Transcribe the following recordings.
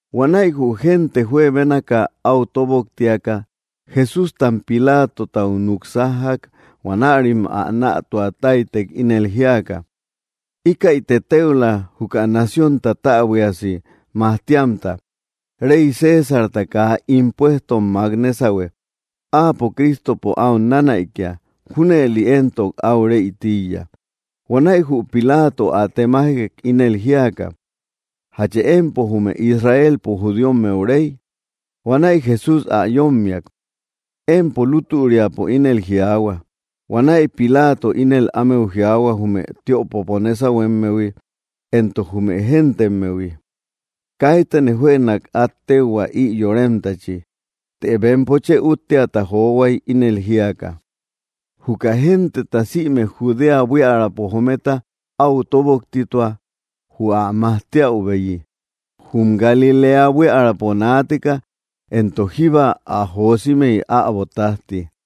Huanäi jü génte juebénaka áu tóboktiaka, Jesústam Pilatotau núk sájjak. Huanärim ä nätua táytek, ínel jíaka: —Íkäite téula, juka naciónta täbuiasi majtiamta. Rey Césarta kaa impuestom mák nésahue. Áapo Cristopo áu nanäikia; junëli éntok áu rey tíiya. Huanäi jü Pilato ä temajek, ínel jíaka: —¿Jachë empo jume Israelpo judíommeu Rey? Huanäi Jesús ä yómmiak: —Empo lútüriapo ínel jiaahua. Huanäi Pilato ínel ámeu jiaahua jume tiöpopo nésahuemmehui, éntok jume géntemmehui: —Kaitane juënak át téuhua, ï yoremtachi. Të bempo chë úttiata johuay, ínel jíaka: —Juka genteta sïme Judea buiärapo jometa áu tóboktitua jü ä majtiäubeyi. Jum Galiléa buiärapo naateka, éntok jíba ä josimey, äbo tájti.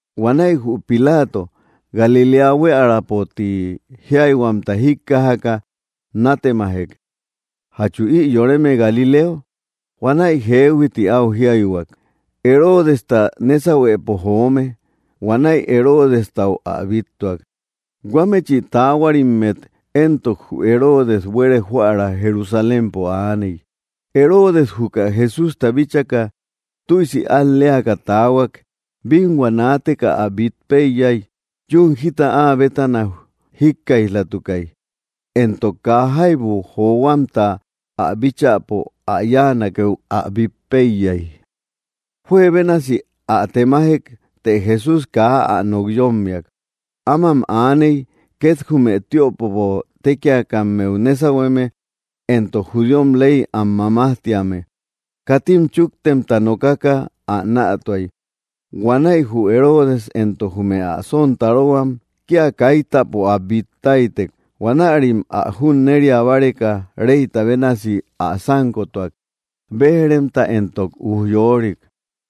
Huanäi jü Pilato, Galiléa buiärapo ti jíayhuamta jíkkajaka, nátemajek: —¿Jachu ï yoreme Galileo? Huanäi jeehui ti áu jiaihuak, Heroodesta nésahuepo joome. Huanäi Heroodestau ä bíttuak. Huámechi taahuarimmet éntok jü Heroodes buere joära Jerusalémpo aaney. Heroodes juka Jesústa bíchaka, tüisi al‑leaka taahuak. Bínhua naateka ä bít péiyay. Yún jita áa bétana jíkkaij‑latukay, éntok kaa jaibu johuamta ä bíchäpo ä yáanakeu ä bít péiyay. Juebénasi ä temajek, të Jesús kaa ä nok yómmiak. Ámam aaney, két jume tiöpopo tékiakammeu nésahueme éntok judíom ley am mamajtíame. Katim chúktemta nokaka ä nätuay. Huanäi jü Heroodes éntok jume ä sontarohuam kía kaitäpo ä bít táytek. Huanärim ä junneria báreka reyta bénasi ä sánkotuak, béj‑remta éntok ujyorik.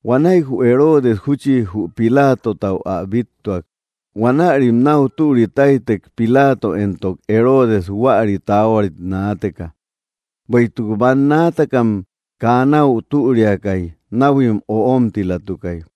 Huanäi jü Heroodes júchi jü Pilatotau ä bíttuak. Huanärim náu türi táytek Pilato éntok Heroodes huäri taahuarit naateka; bueïtuk bannaatakam kaa náu türiakay, náhuim öomtilatukay.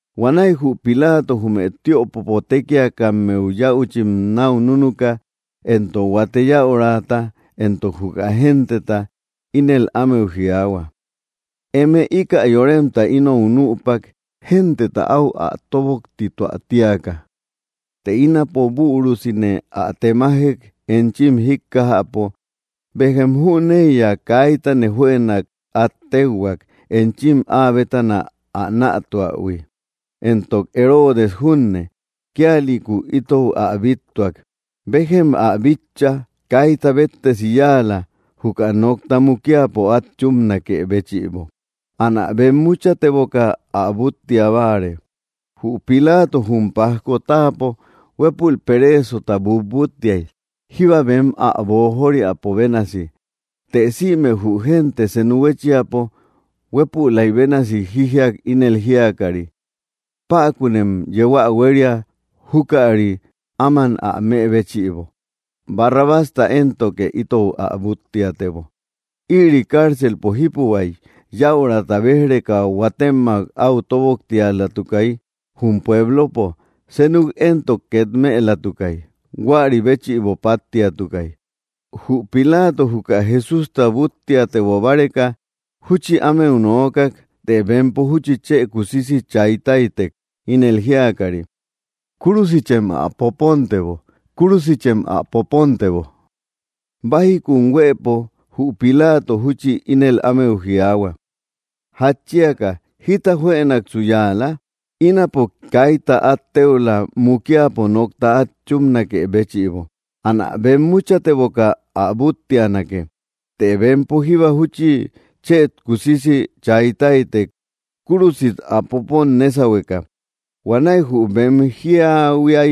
Huanäi jü Pilato jume tiöpopo tékiakammeu yäuchim náu núnuka, éntok huate yäuraata, éntok juka genteta, ínel ámeu jiaahua: —Eme íkä yoremta inou nüpak, genteta áu ä tóboktituä tíaka; të ínapo bürusine ä temajek enchim jíkkajäpo; béjem jüneiya kaitane juënak át téuhuak, enchim áa bétana ä nätuähui. Éntok Heroodes junne, kíalïku itou ä bíttuak. Béjem ä bitcha; kaita béttesi yáala, juka nokta mukiapo át chúpanakë béchïbo. Anä bemmuchateboka ä búttia báare. Jü Pilato jum pajko táapo huépul pereesota butbúttiay, jíba bem ä boojoriapo bénasi. Të sïme jü génte senu huéchiapo huépülay bénasi jijiak, ínel jíakari: —¡Päkunem yeu ä huéria júkäri, áman ä më béchïbo! ¡Barrabásta éntoke itou ä búttiatebo! Ïri cárcelpo jípuhuay. Yäurata béj‑reka huatemmak áu tóboktialatukay jum pueblopo; senuk éntok két mëlatukay. Huäri béchïbo páttiatukay. Jü Pilato juka Jesústa búttiatebo báreka, júchi ámeu nookak, të bempo júchi chë kusisi chay táytek, ínel jíakari: —¡Kúrusichem ä popontebo! ¡Kúrusichem ä popontebo! Bájikum huëpo, jü Pilato júchi ínel ámeu jiaahua: —¿Jatchiaka jita juënaksu yáala? Ínapo kaita át téula mukiapo nokta át chúpnakë béchïbo. Anä bemmuchateboka ä búttianake. Të bempo jíba júchi chë kusisi chay táytek, kúrusit ä popon nésahueka. Huanäi jü bem jiahuia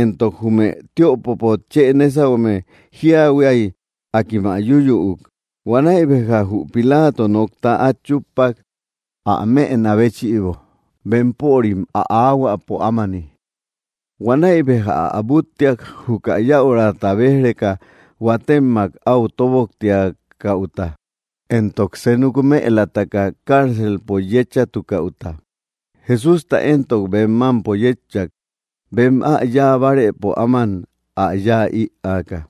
éntok jume tiöpopo chë nésahueme jiahuia, akim ä yúyüuk. Huanäi béja jü Pilato nokta át chúppak, ä mëna béchïbo bempörim ä aahuäpo ámani. Huanäi béja ä búttiak, juka yäurata béj‑reka huatemmak áu tóboktiakäuta, éntok senuk mëlataka cárcelpo yéchatukäuta. Jesústa éntok bem mámpo yétchak, bem ä yáa bárëpo áman ä yáa ïaka.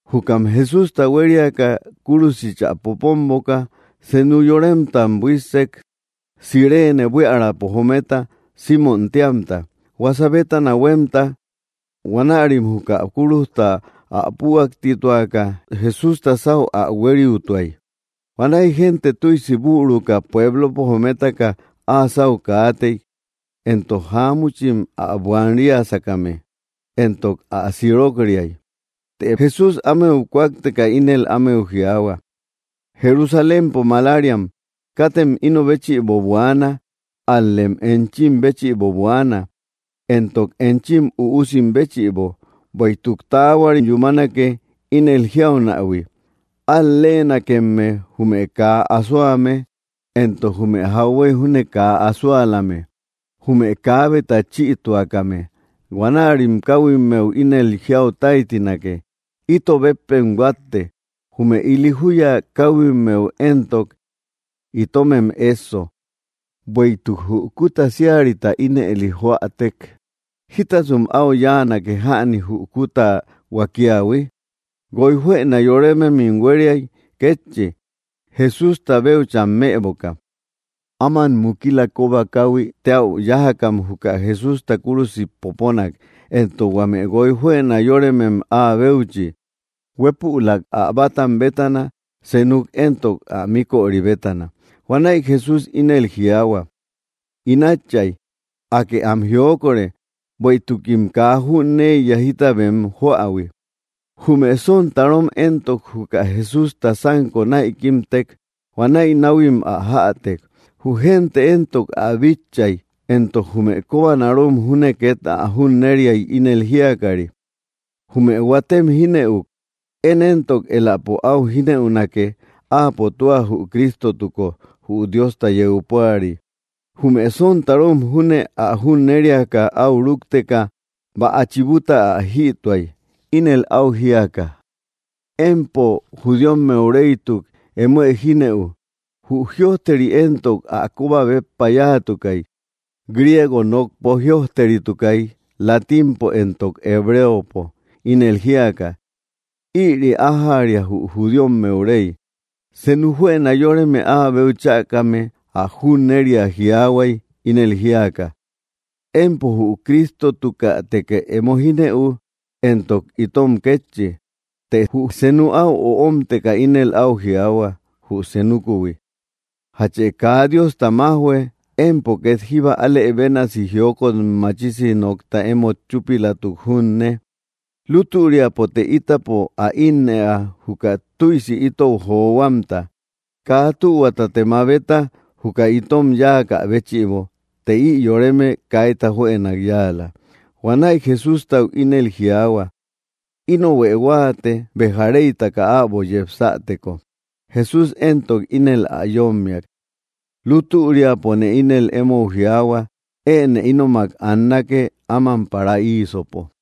Jukam Jesústa huériaka kúrusichä poponboka, senu yoremtam buíssek, Cireene buiärapo jometa Símon téamta, huasa bétana huémta. Huanärim juka kúrujta ä püaktituaka, Jesústa sáu ä huériutuay. Huanäi génte tüisi büruka pueblopo jometaka áa sáu kaatey, éntok jáamuchim ä buanria sákame, éntokim ä sirok‑riay. Të Jesús ámeu kúakteka ínel ámeu jiaahua: —Jerusalémpo malariam, katem ino béchïbo buaana, ál‑lem enchim béchïbo buaana, éntok enchim üusim béchïbo. Bueïtuk taahuari yúmanake, ínel jiaunähui: “Al‑leenakemme, jume kaa asoame éntok jume jauhuey júne kaa asoalame, jume kaabeta chïtuakame.” Huanärim káhuimmeu ínel jiau táytinake: “¡Ito béppem huátte!” Jume ili júya káhuimmeu éntok: “¡Itomem ésso!” Bueïtuk jü kúta síarita ínëli joatek, ¿jítasum áu yáanake jäni jü kúta huakiahui? Guoy juëna yórememim huériay kétchi, Jesústa béucham mëboka. Áman mukila kóba káhuï téäu yájakam juka Jesústa kúrusit poponak, éntok huame guoy juëna yóremem áa béuchi, huépülak ä bátam bétana, senuk éntok ä míköri bétana. Huanäi Jesús ínel jiaahua: —In Átchay, Akë am jiokore, bueïtukim kaa jüneiya jita bem joähui. Jume sontarom éntok, juka Jesústa sánko näikimtek. Huanäi náhuim ä jätek. Jü génte éntok ä bitchay, éntok jume kobanarom júne két ä junneriay, ínel jíakari: —Jume huatem jínëuk. Én éntok éläpo áu jínëunake, áapo tua jü Cristotuko, jü Diosta yeu púari. Jume sontarom júne ä junneriaka áu rúkteka, bäa chibuta ä jïtuay, ínel áu jíaka: —Empo judíommeu reytuk, emoë jínëu. Jü jïojteri éntok ä kóba béppa yáatukay. Griego nokpo jïojteritukay, latínpo éntok hebreopo, ínel jíaka: “Ïri ájäria jü judíommeu Rey.” Senu juëna yoreme áabeu chäkame ä junneria jiaahuay, ínel jíaka: —Empo jü Cristotukätekë emo jínëu, éntok itom kétchi. Të jü senu áu omteka ínel áu jiaahua jü senukuhui: —¿Jachë kaa Diosta májhue, empo két jíba alë bénasi jiokot machisi nokta emót chúpilatuk junne? Lutüriapote ítapo ä ínnëa, juka tüisi itou johuamta. Kaa tühuatate mabeta juka itom yáakä béchïbo; të ï yoreme kaita juënak yáala. Huanäi Jesústau ínel jiaahua: —Inohuë huáate, béja reytaka äbo yepsäteko. Jesús éntok ínel ä yómmiak: —Lútüriapone ínel émou jiaahua, enë sep ínomak annake, áman paraísöpo.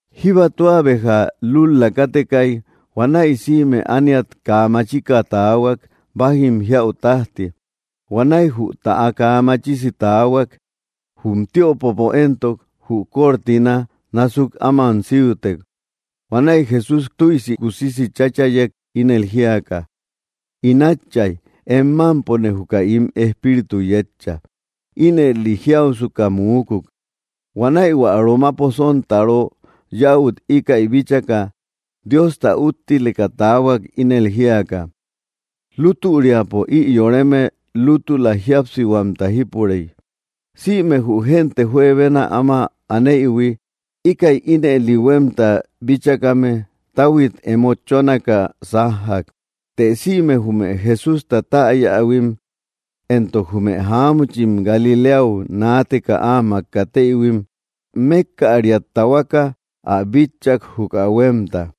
Jíba tua béja lúl‑la kátekay. Huanäi sïme ániat kaa machika taahuak, bájim jiäu tájti. Huanäi jü täa kaa machisi taahuak. Jum tiöpopo éntok, jü cortina násuk áman síutek. Huanäi Jesús tüisi kusisi cháchayek, ínel jíaka: —In Átchay, em mámpone juka ín espíritu yétcha. Ínëli jiausuka muukuk. Huanäi hua romapo sontaro yäut íkäi bíchaka, Diosta úttileka taahuak, ínel jíaka: —Lútüriapo ï yoreme lútüla jíapsihuamta jípurey. Sïme jü génte juebena áma aneïhui, íkäi ínëli huémta bíchakame, táhuit emo chónaka sájjak. Të sïme jume Jesústa täyähuim, éntok jume jáamuchim Galiléau naateka áamak kateïhuim, mékkäriat tahuaka ä bitchak, juka huémta.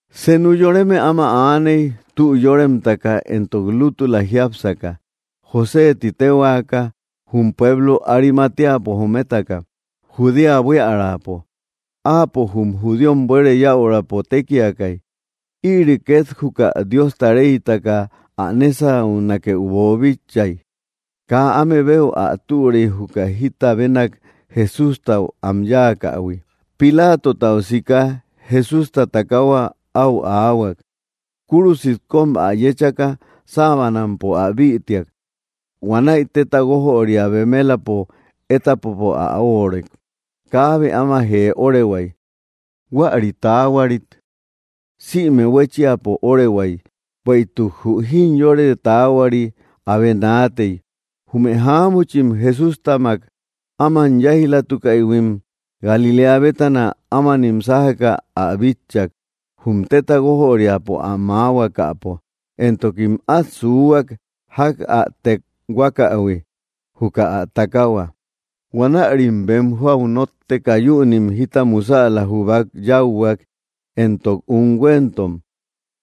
Senu yoreme áma aaney, tü yóremtaka entok lútüla jiápsaka, José tï téhuaka, jum pueblo Arimateapo jometaka, Judea buiärapo. Áapo jum judíom buere yäurapo tékiakay. Ïri két juka Diosta reytaka ä nésaunakeu boobíchaïhuiy. Kaa ámebeu ä türey, juka jita benak Jesústau am yáakähui. Pilatotau sika Jesústa takahua áu aahuak. Kúrusit kóm ä yéchaka, sábanampo ä bïtiak. Huanäi téta guójöria bemelapo étapopo ä óorek; kaabe áma jee órehuay. Huäri taahuarit sïme huéchiapo óorehuay, bueïtuk jü jimyóre taahuari abe naatey. Jume jáamuchim Jesústamak áma yáij‑latukaïhuim Galiléa bétana, ámanim sájaka ä bitchak, jum téta guójöriapo ä maahuakäpo; éntokim át suuhuak, ják ä tekhuakähui juka ä takahua. Huanärim bem joau nótteka, yünim jita musäla jubak yáuhuak, éntok unhuentom.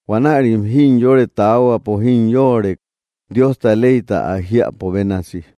Huanärim jimyore taahuapo jimyoorek, Diosta leyta ä jiäpo bénasi.